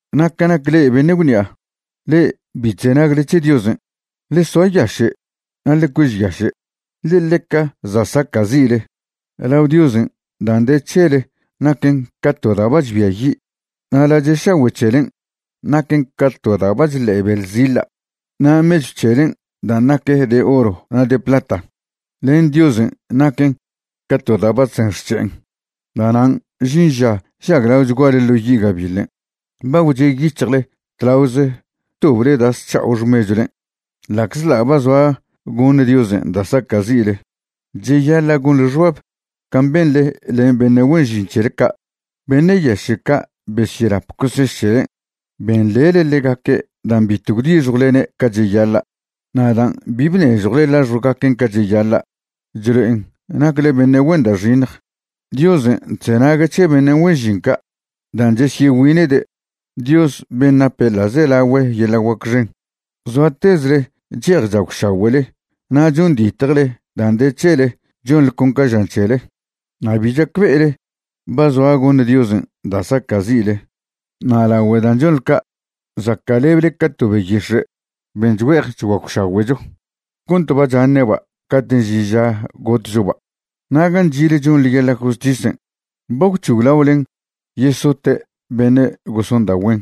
Na' ca nac le'e beṉe' gwṉi'a, le'e bi chzenagle c̱he Diosen', ḻe soayaše' na' ḻe cuežyaše', ḻe ḻeca za' saca'zi'le. Lao Diosen' dan' de c̱hele naquen ca to da' ba chbiayi', na' lache' šagüe' c̱helen' naquen ca to da' ba chḻe'e beḻziḻa'. Na' mechw c̱helen' dan' nac de oro na' de plata, len Diosen' naquen ca to da' ba chzen xc̱he'en. Da'nan' žin ža žaglaochguale ḻo yi' gabiḻen'. Ba gwche' yic̱hjle tlaoze btoble da' sc̱ha'o xmechwlen', ḻa'czḻa' ba zoa goṉ Diosen' da' saca'zi'le. Cheyaḻa' gonḻe xbab can' benḻe len beṉe' güen žin c̱hele ca', beṉe' yaše' ca' besyelap coseš c̱helen'. Benḻele ḻegaque' dan' bitw gwdixjwlene' ca cheyaḻa'. Na' dan' bi bnežjwle laxjwgaquen' ca cheyaḻa', chlo'en nacle beṉe' güen da' xiṉj. Diosen' chzenague' c̱he beṉe' güen žin ca' dan' chesyegüine'de', Dios ben' nape ḻa'zelagüe yeḻa' guac xen. Zoatezle che'ej chagwšagüe'le na' chonditjele dan' de c̱hele chonḻe con ca žan c̱hele, na' bi chacbe'ele ba zoa goṉ Diosen' da' saca'zi'le. Na' lagüe dan' chonḻe ca', zaca'leble ca to beyix̱e' ben' chgüe'ej chguagwšagüe'cho cont ba chaṉe'ba' cate' žin ža gotchoba'. Na' gan' chi'le chonḻe yeḻa' justisen', ba gwc̱hoglaolen yesote' beṉe' goson da' güen,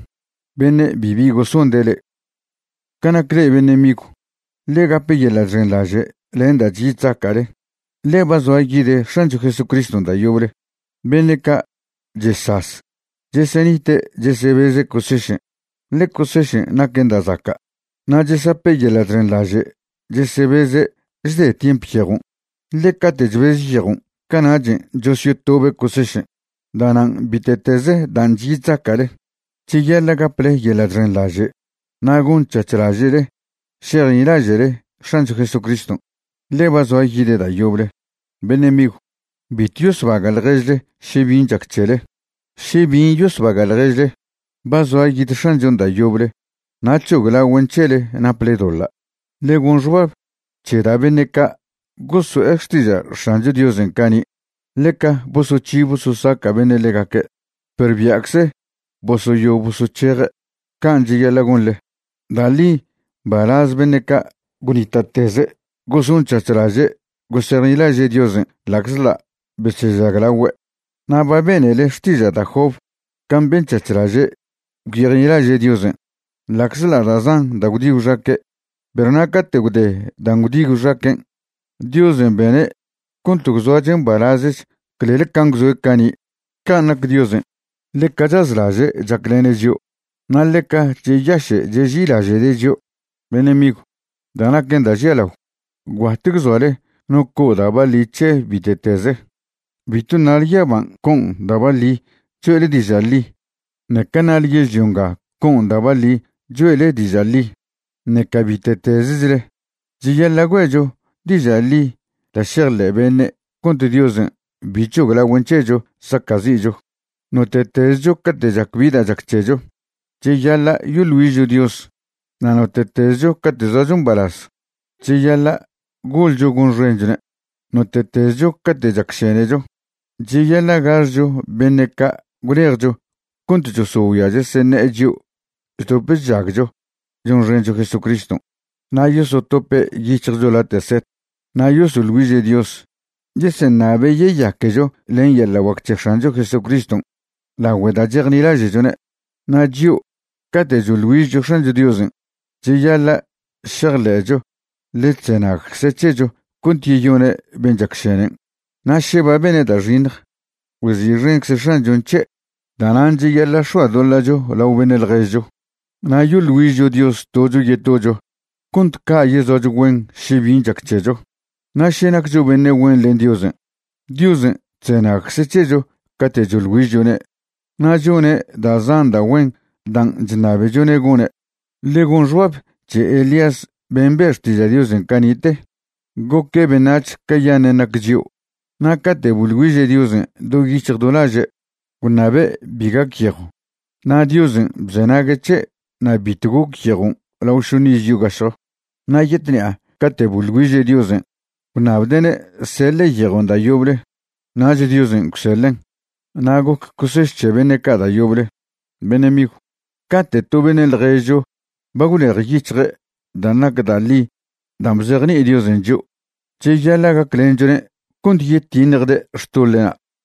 beṉe' bibi gosonde' le'e. Ca nac le'e beṉe' migw, ḻe gape yeḻa' chxenḻaže' len dan' chyi chzaca'le, ḻe ba zoa yid X̱ancho Jesucriston' da' yoble. Beṉe' ca' chesaz, chesenite' chesebeze' cosešen', ḻe cosešen' naquen da' zaca'. Na' chesape' yeḻa' chxenḻaže' chesebeze' chde tiemp yejon', ḻe cate' chbeze yejon', cana'chen' chosyotobe' cosešen'. Da'nan' bite'teze dan' chyi chzaca'le, cheyaḻa' gaple yeḻa' chxenḻaže' na' gonc̱hac̱hlaže'le šejnilaže'le X̱ancho Jesucriston', ḻe ba zoa yide' da' yoble. Beṉe' migw, bitw yosbaga' ḻježle še bin' chac c̱hele. Še bin' yosbaga' ḻježle, ba zoa yid X̱anchon' da' yoble na' c̱hoglagüen' c̱hele naple doḻa'. Ḻe gon xbab c̱he da' beṉe' ca' goso'e xtiža' X̱ancho Diosen' cani'. Ḻeca bosoc̱hi bososaca' beṉe' ḻegaque', perw bia'cze bosoyo bosoc̱heje', can' cheyaḻa' gonḻe. Da' ḻi mbalaz beṉe' ca' gwnita'teze' gosonc̱hac̱hlaže' gosejnilaže' Diosen' ḻa'czḻa' besežaglagüe'. Na' ba benele xtiža' da' Job can' benc̱hac̱hlaže' gwyejnilaže' Diosen', ḻa'czḻa' da' zan da' gwdi gwxaque'. Perw na' cate' gwde dan' gwdi gwxaquen', Diosen' bene' cont gwzoache' mbalazch clel can' gwzoe' cani'. Can' nac Diosen', ḻeca chazlaže' chaclene' chio', na' ḻeca cheyaše' cheži'ilaže'de' chio'. Beṉe' migw, da' naquen da' žialao, gwbat gwzoale no co' da' baḻi c̱he bite'teze. Bitw ṉale yaban' co'on da' baḻi choe'le diža' ḻi, ṉeca ṉale yežlio nga co'on da' baḻi choe'le diža' ḻi, ṉeca bite'tezechle. Cheyaḻa' güe'cho diža' ḻi da' šejḻe' beṉe' cont Diosen' bi c̱hoglagüen' c̱hecho saca'zi'cho. Note'tezcho cate' chac bi da' chac c̱hecho, cheyaḻa' yoḻ güižcho Dios. Na' note'tezcho cate' zoacho mbalaz, cheyaḻa' goḻcho gonxenchone'. Note'tezcho cate' chacšenecho, cheyaḻa' gaxcho beṉe' ca' gwlejcho cont chosogüia cheseṉe'e chio' chdop chžagcho chonxencho Jesucriston'. Na' yosotope' yic̱hjcho late' set, na' yosoḻ güiže' Dios, yeseṉabe' yeyaquecho len yeḻa' guac c̱he X̱ancho Jesucriston' lagüe' da' chejnilaže'chone'. Na' chio', cate' choḻ güižcho X̱ancho Diosen', cheyaḻa' šejḻe'cho ḻe chzenagcze' c̱hecho cont yeyone' ben' chacšenen', na' še ba bene' da' xiṉj, güezi'xencze X̱anchon' c̱he'. Da'nan' cheyaḻa' x̱oadoḻa'cho lao beṉe' ḻježcho na' yoḻ güižcho Dios tocho yetocho cont ca' yezoacho güen še bin' chac c̱hecho. Na' še naccho beṉe' güen len Diosen', Diosen' chzenagcze' c̱hecho cate' choḻ güižchone' na' chone' da' zan da' güen dan' chṉabechone' gone'. Ḻe gon xbab c̱he Elías ben' be' xtiža' Diosen' cani'te. Goque' beṉac̱h cayaṉen' nac chio'. Na' cate' boḻ güiže' Diosen' do yic̱hj do laže' gwṉabe' bi gac yejw, na' Diosen' bzenague' c̱he' na' bitw goc yejon' lao šoṉ iz yogašjo. Na' yetṉi'a cate' boḻ güiže' Diosen' gwṉabde'ne' seḻe' yejon' da' yoble, nach Diosen' gwseḻen'. Na' goc coseš c̱he beṉe' ca' da' yoble. Beṉe' migw, cate' to beṉe' ḻježcho ba gwlejyic̱hje' dan' nac da' ḻi dan' bzejni'i Diosen' chio', cheyaḻa' gaclenchone' cont yetiṉjde' xtoḻe'na'.